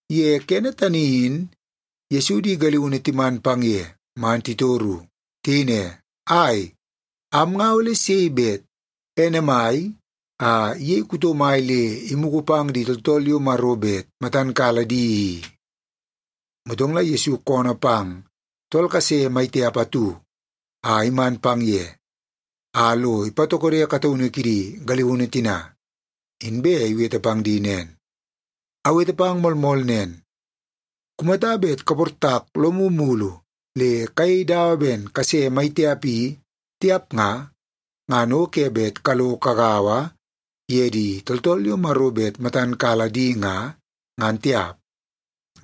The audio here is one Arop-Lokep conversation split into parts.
Ye kene tani in Yesu di galiunu timan pang ye man titoru. Tiyei ne, “Ai, am nga ole sei bet ene mai a iyei kuto mai le imugu pang di tooltool yo Maro bet matan kala di i?” Motong la Yesu koonoo pang tool kase mai tiap atu a iman pang ye, a lo ipatokode kataunu kidi galiunu tina, inbe iwete pang di nen, “Awete pang moolmool nen, kumata bet kaportak lomu mulu le kayei dawa ben kase mai tiap i, tiap nga, ngan o ke bet kalo kagaua ye di tooltool yo Maro bet matan kala di nga, ngan tiap.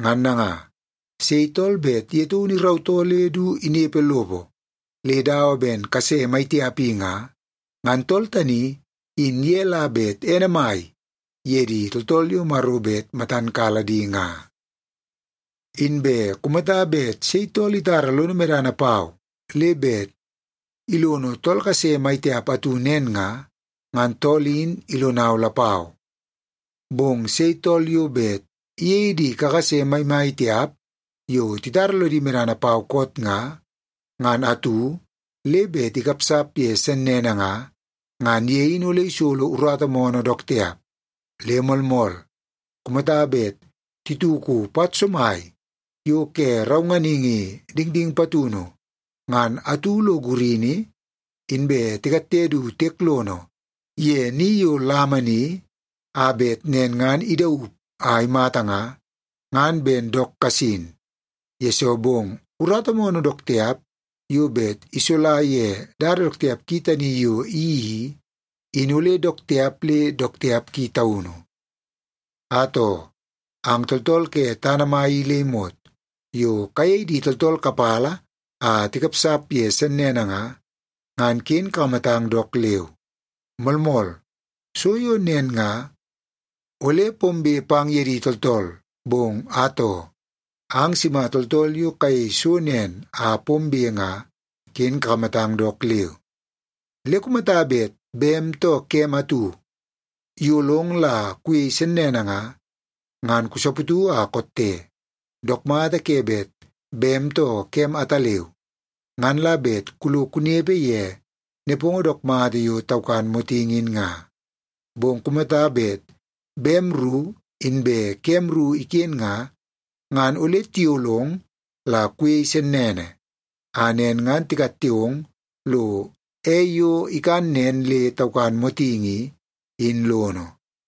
Ngan nanga, sei tool bet ye taunu irautoo le du inepe lopo le dawa ben kase mai tiap i nga, ngan tool tani in ye la bet ene mai ye di tooltool yo Maro bet matan kala di nga. “Inbe kumata bet sei tool itara lono medana pau le bet ilono tool kase mai tiap atu nen nga, ngan tool in ilonau lapau. Bong sei tool yo bet iyei di kakase maimai tiap yo titara lodi medana pau koot nga, ngan atu, le bet ikapsap ye sennene nga, ngan ye in ole isolo urata moonoo dook tiap. Le moolmool, kumata bet tituku pat somai yo ke raunganingi dingding patunu ngan atu lo gurini, inbe tikatte du tiek lono ye ni yo lama ni a bet nen ngan idaup a imata nga, ngan ben dook kasin, yesoo bong urata moonoo dook tiap yo bet isola ye dada dook tiap ki tani yo iyeii i, in ole dook tiap le dook tiap ki taunu. “Atoo, ang tooltool ke tana mai i le imot yo kayei di tooltool kapala a tikapsap ye sennene nga, ngan ken kakamatang dook leu! Moolmool, so yo nen nga, ole pombe pang ye di tooltool, bong atoo, ang sima tooltool yo kayei so nen a pombe nga, ken kakamatang dook leu! Le kumata bet bem too kem atu iyolong la kuyei sennene nga, ngan kusaputu a kotte. Dook mata ke bet bem too kem ataleu, ngan la bet kulo kunepe ye nepongo dook mata yo taukan motingi in nga. Bong kumata bet bem ru inbe kem ru iken nga, ngan ole tiyolong la kuyei sennene, a nen ngan tikatte ong lo ei yo ikan nen le taukan motingi i, in lono.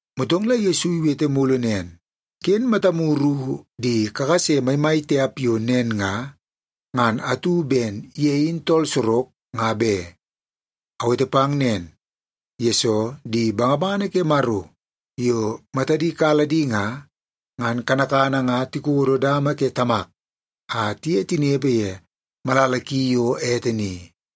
Motong la Yesu iwete mulu nen, “Ken matamu ru di kakase maimai tiap yo nen nga, ngan atu, ben ye in tool sorok, nga be. Awete pang nen, yesoo di bangabangana ke Maro yo matadi kala di nga, ngan kanakana nga tikodo dama ke Tamak a tiye tinepe ye malala ki yo ete ni.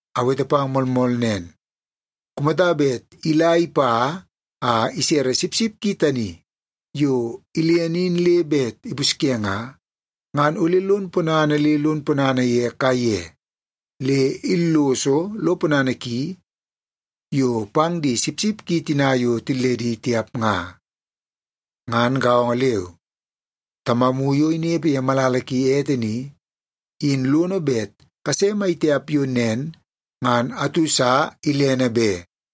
Awete pang moolmool nen, kumata bet ila ipa a isere sipsip ki tani yo ilene in le bet ipusye nga, ngan ole lon ponana le lon ponana ye kaiye, le illoso lo ponana ki yo pang di sipsip ki tina yo tilledi tiap nga. Ngan gaongo leu, Tamamu yo inepe ye malala ki ete ni, in lono bet kase maitiap yo nen ngan atu sa ilene be.”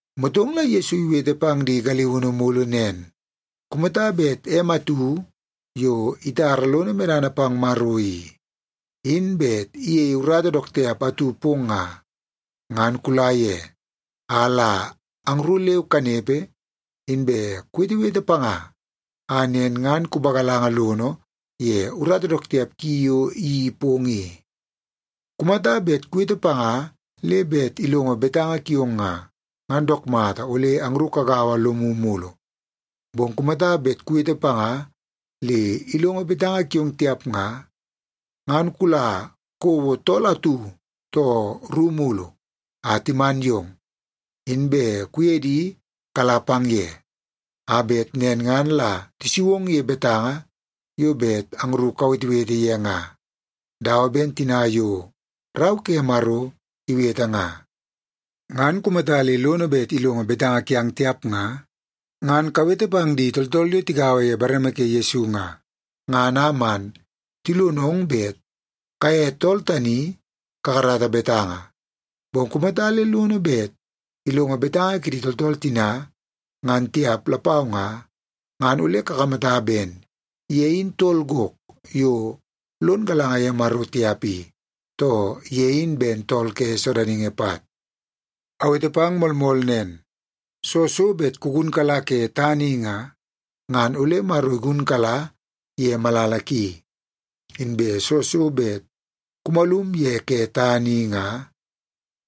Motong la Yesu iwete pang di galiunu mulu nen, “Kumata bet em atu yo itara lono medana pang Maro i, in bet iyeie urata dook tiap atu pong nga, ngan kula ye a la angru leu kanepe, inbe kuwetewete panga a nen ngan kupagalanga lono ye urata dook tiap ki yo iyeii pong i. Kumata bet kuwete panga le bet ilongo betanga kiong nga, ngan dook mata ole angru kagaua lomu mulu. Bong kumata bet kuwete panga le ilongo betanga kiong tiap nga, ngan kula kouo tool atu too ru mulu a timan yong, inbe kuye di kala pang ye, a bet nen ngan la tisu ong ye betanga yo bet angru kawetewete ye nga, dawa ben tina yo Rau ke Maro iwete nga. Ngan kumata le lono bet ilongo betanga kiang tiap nga, ngan kawete pang di tooltool yo tigaua ye bareme ke Yesu nga, ngan a man tilonong bet kaye tool tani kakarata betanga. Bong kumata le lono bet ilongo betanga kidi tooltool tina, ngan tiap lapau nga, ngan ole kakamata ben ye in tool gok yo lon galanga ye Maro tiap i, too ye in ben tool ke sodaningi pat. “Awete pang moolmool nen, soo so bet kugunkala ke tana i nga, ngan ole Maro igunkala ye malala ki. Inbe soo so bet kumalum ye ke tana i nga,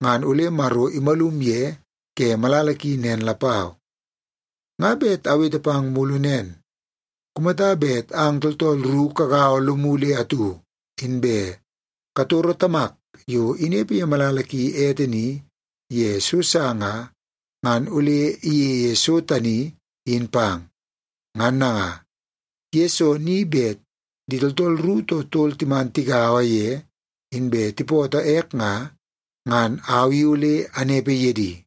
ngan ole Maro imalum ye ke malala ki nen lapau. “Nga bet awete pang mulu nen. Kumata bet ang tooltool ru kagaua lomu le atu, inbe katoro Tamak yo inepe ye malala ki ete ni ye so sa nga, ngan ole iyeie so tani, in pang. Ngan nanga, ye soo ni bet di tooltool ru too tol timan tigaua ye inbe tipootoo ek nga, ngan au i ole anepe ye di.”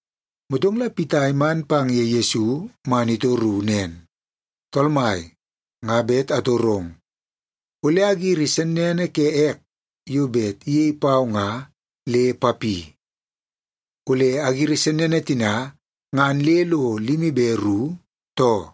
Motong la Pita iman pang ye Yesu man itoru nen, “Tool Mai, nga bet atorong. Ole agiri sennene ke ek yo bet iyei pau nga, le papi? Ole agiri sennene tina ngan le lo limi be ru, too?”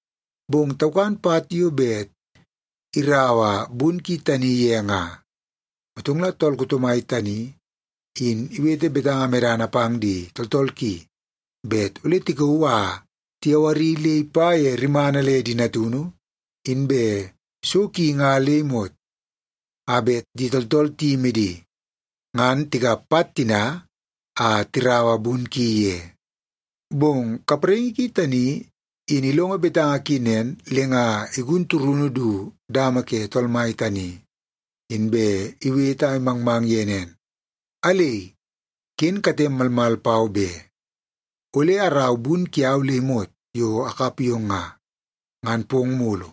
Bong taukan pat yo bet iraua bun ki tani ye nga. Motong la tool kuto mai tani in iwete betanga medana pang di tooltool ki bet ole tikauu a tiyawari le ipa ye rimana le di natunu inbe so ki nga le imot, a bet di tooltool tiyimi di, ngan tikap pat tina a tiraua bun ki ye. “Bong kapraingi ki tani in ilongo betanga ki nen, le nga igun turunu du dama ke tool mai tani, inbe iwete a imangmang ye nen, ‘Alei, ken katem malmal pau be! Ole arau bun kiau le imot yo akap yong nga, ngan pong mulu.’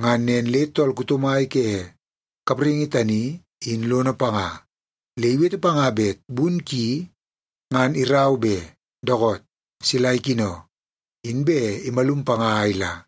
Ngan nen le tool kuto mai ke kapraingi tani in lono panga, le iwete panga bet bun ki ngan irau be. Dookoot, sila ikino. Inbe imalum panga a ila.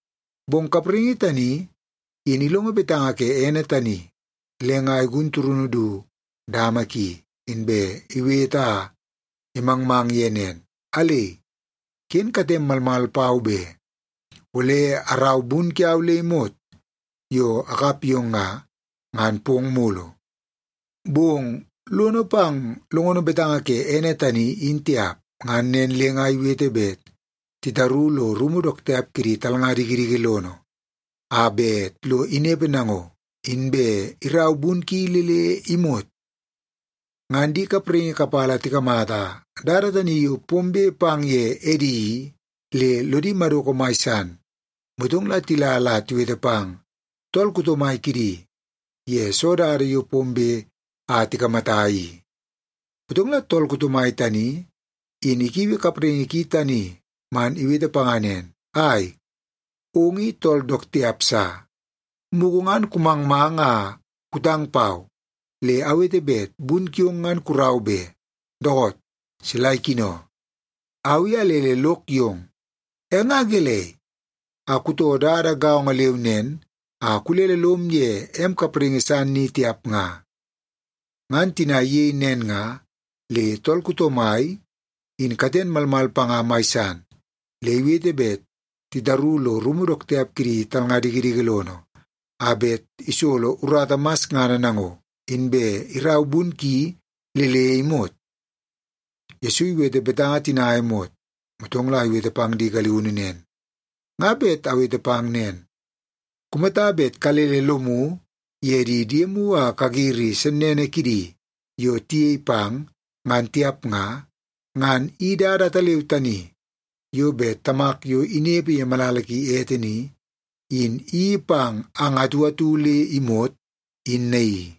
“Bong kapraingi tani in ilongo betanga ke ene tani, le nga igun turunu du dama ki, inbe iwete a imangmang ye nen, ‘Alei, ken katem malmal pau be! Ole arau bun kiau le imot yo akap yong nga, ngan pong mulu.’ “Bong lono pang longono betanga ke ene tani, in tiap. Ngan nen le nga iwete bet titaru lo rumu dook tiap kidi talnga dikidiki lono a bet lo inepe nango, inbe irau bun ki le le imot. Ngan di kapraingi kapala tikamata dada tani yo pombe pang ye edi i, le lodi madoko mai san. Motong la tila la tiwete pang tool kuto mai kidi ye soo dada yo pombe a tikamata i. “Motong la tool kuto mai tani, in ikiui kapraingi ki tani man iwete panga nen, ‘Ai, ong i tool dook tiap sa! Mugu ngan kumangmang a kutang pau, le awete bet bun kiong ngan kurau be. Dookoot, sila ikino. Au i alele lok yong, e nga gelei a kutoo dada gaongo leu nen a kulele lom ye em kapraingi san ni tiap nga?’ Ngan tina iyei nen nga, le tool kuto mai in katen malmal panga mai san le iwete bet titaru lo rumu dook tiap kidi talnga dikidiki lono a bet isolo urata masngana nango, inbe irau bun ki le le imot.” Yesu iwete betanga tina a imot, motong la iwete pang di galiunu nen, “Nga bet awete pang nen, kumata bet kalele lomu ye di diemu a kagiri sennene kidi yo tiyei pang, ngan tiap nga, ngan i dada ataleu tani yo bet Tamak yo inepe ye malala ki ete ni, in iyeii pang ang atu atu le imot, in naii.”